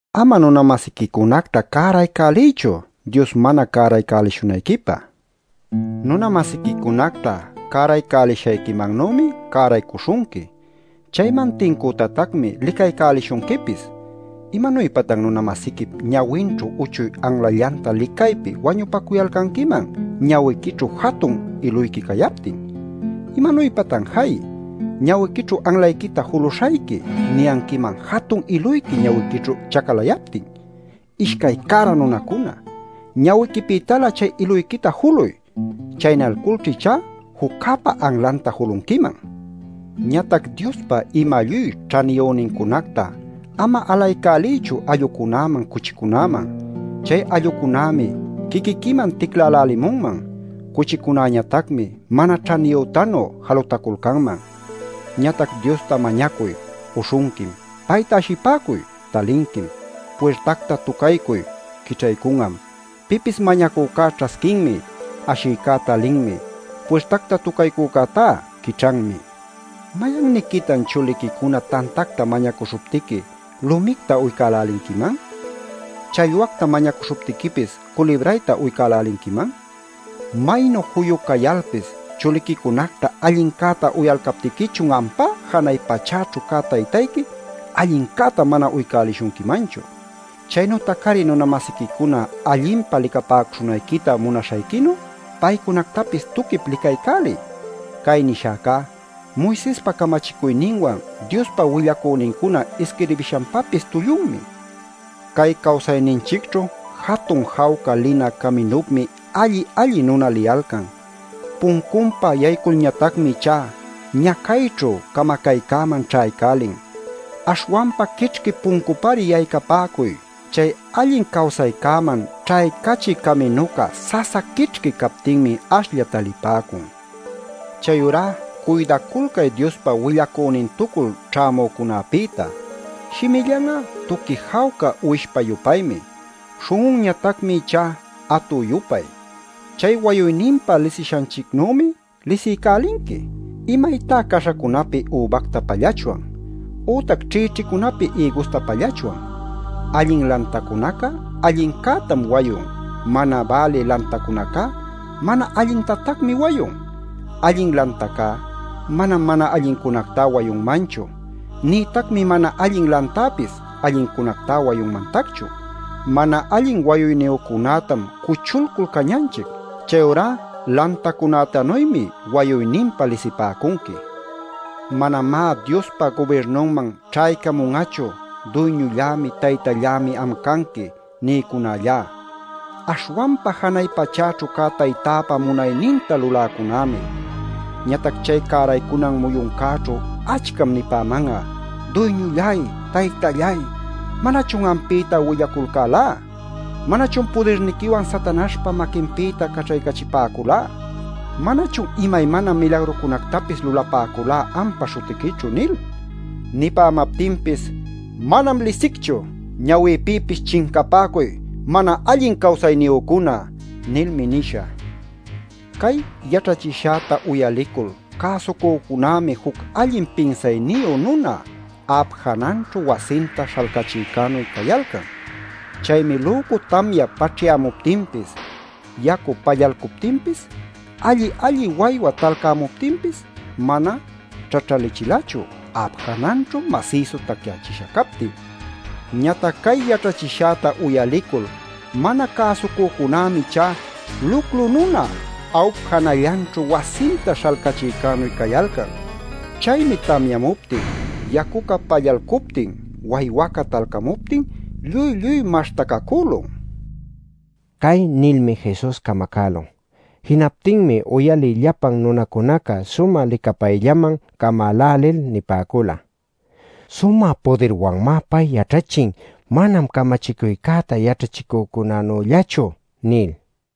“Ama nuna-masiquicunacta cäraycäliychu Dios mana cäraycälishunayquipä. Nuna-masiquicunacta cäraycälishayquimannümi cäraycuśhunqui. Chayman tincütatacmi licaycälishunquipis. “¿Imanuypatan nuna-masiquip ñawinćhu uchuy anlallanta licaypi wañupacuyalcanquiman ñawiquićhu jatun iluyqui cayaptin? ¿Imanuypatan ‘Jay, ñawiquićhu anlayquita juluśhayqui’ niyanquiman jatun iluyqui ñawiquićhu chacalayaptin? ¡Ishcay cära nunacuna! Ñawiquipïtalä chay iluyquita juluy. Chaynalculćha ichá juccäpa anlanta julunquiman. “Ñatac Diospa ima lluy ćhaniyünincunacta ama alaycäliychu allucunäman cuchicunäman. Chay allucunämi quiquiquiman ticlälälimunman. Cuchicunäñatacmi mana ćhaniyütanu jalutaculcanman. “Ñatac Diosta mañacuy; uśhunquim. Payta ashipäcuy; talinquim. Puirtacta tucaycuy; quićhaycun'am. Pipis mañacücá ćhasquinmi; ashïcá talinmi; puirtacta tucaycücätá quićhanmi. ¿Mayanniquitan chuliquicuna tantacta mañacuśhuptiqui lumicta uycälälinquiman? ¿Challwacta mañacuśhuptiquipis, culibrayta uycälälinquiman? ¡Maynu juyu cayalpis chuliquicunacta allincäta uyalcaptiquichun ampá janay pachaćhu cä Taytayqui, allincäta mana uycälishunquimanchu! “Chaynütac-ari nuna-masiquicuna allinpa licapäcuśhunayquita munaśhayquinu paycunactapis tuquip licaycäliy. Cay nishäcá Moisespa camachicuyninwan Diospa willacünincuna isquirbishanpapis tullunmi. “Cay cawsayninchicćhu jatun jawca linä caminupmi alli-alli nuna liyalcan. Puncunpa yaycuyculñatacmi ichá ñacayćhu camacaycäman ćhaycälin. Aśhwanpa quićhqui puncupari yaycaycapäcuy. Chay allin cawsaycäman ćhaycachï caminuca sasa quićhqui captinmi ashlla talipäcun. “Chayurá cuydaculcay Diospa willacünintucul ćhämücunapïta. Shimillan'a tuqui jawca uwishpa-yupaymi. Śhun'unñatacmi ichá atü-yupay. Chay wayuyninpa lisishanchicnümi lisiycälinqui. ¿Imaytá caśhacunapi übacta pallachwan? ¿Ütac ćhïćhicunapi ïgusta pallachwan? Allin lantacunaca allincätam wayun. Mana bälï lantacunacá mana allintatacmi wayun. Allin lantacá manam mana allincunactá wayunmanchu. Nïtacmi mana allin lantäpis allincunactá wayunmantacchu. Mana allin wayuyniyücunätam cuchulcul cañanchic. Chayurá lantacunätanuymi wayuyninpa lisipäcunqui. “Manamá Diospa gubirnunman ćhaycamun'achu ‘Duyñullämi, Taytallämi am canqui’ nïcunallá, aśhwanpa janay pachäćhu cä Taytäpa munayninta luläcunämi. Ñatac chay cäraycunan muyuncäćhu achcam nipäman'a: ‘Duyñulláy, Taytalláy, ¿manachun ampïta willaculcälá? ¿Manachun pudirniquiwan Satanaśhpa maquinpïta caćhaycachipäculá? ¿Manachun imaymana milagrucunactapis lulapäculá ampa śhutiquićhu?’ nil. Nipämaptinpis: ‘¡Manam lisicchu. Ñawïpïpis chincapäcuy, mana allin cawsayniyücuna!’ nilmi nishä. “Cay yaćhachishäta uyalicul cäsucücunämi juc allin pinsayniyu nuna a'ap jananćhu wasinta śhalcachïcänuy cayalcan. Chaymi lücu tamya paćhyamuptinpis, yacu pallalcuptinpis, alli-alli waywa talcamuptinpis, mana ćhaćhachilachu a'ap jananćhu masïsu taycachisha captin. Ñatac cay yaćhachishäta uyalicul mana cäsucücunämi ichá luclu nuna a'up janallanćhu wasinta śhalcachïcänuy cayalcan. Chaymi tamyamuptin, yacuca pallalcuptin, waywaca talcamuptin lluy lluy maśhtacacülun” nin. Cay nilmi Jesus camacälun. Jinaptinmi uyalï llapan nunacunaca sumä licapayllaman camälälil nipäcula: “Sumä pudirwanmá pay yaćhachin; manam camachicuycäta yaćhachicücunanüllachu” nil.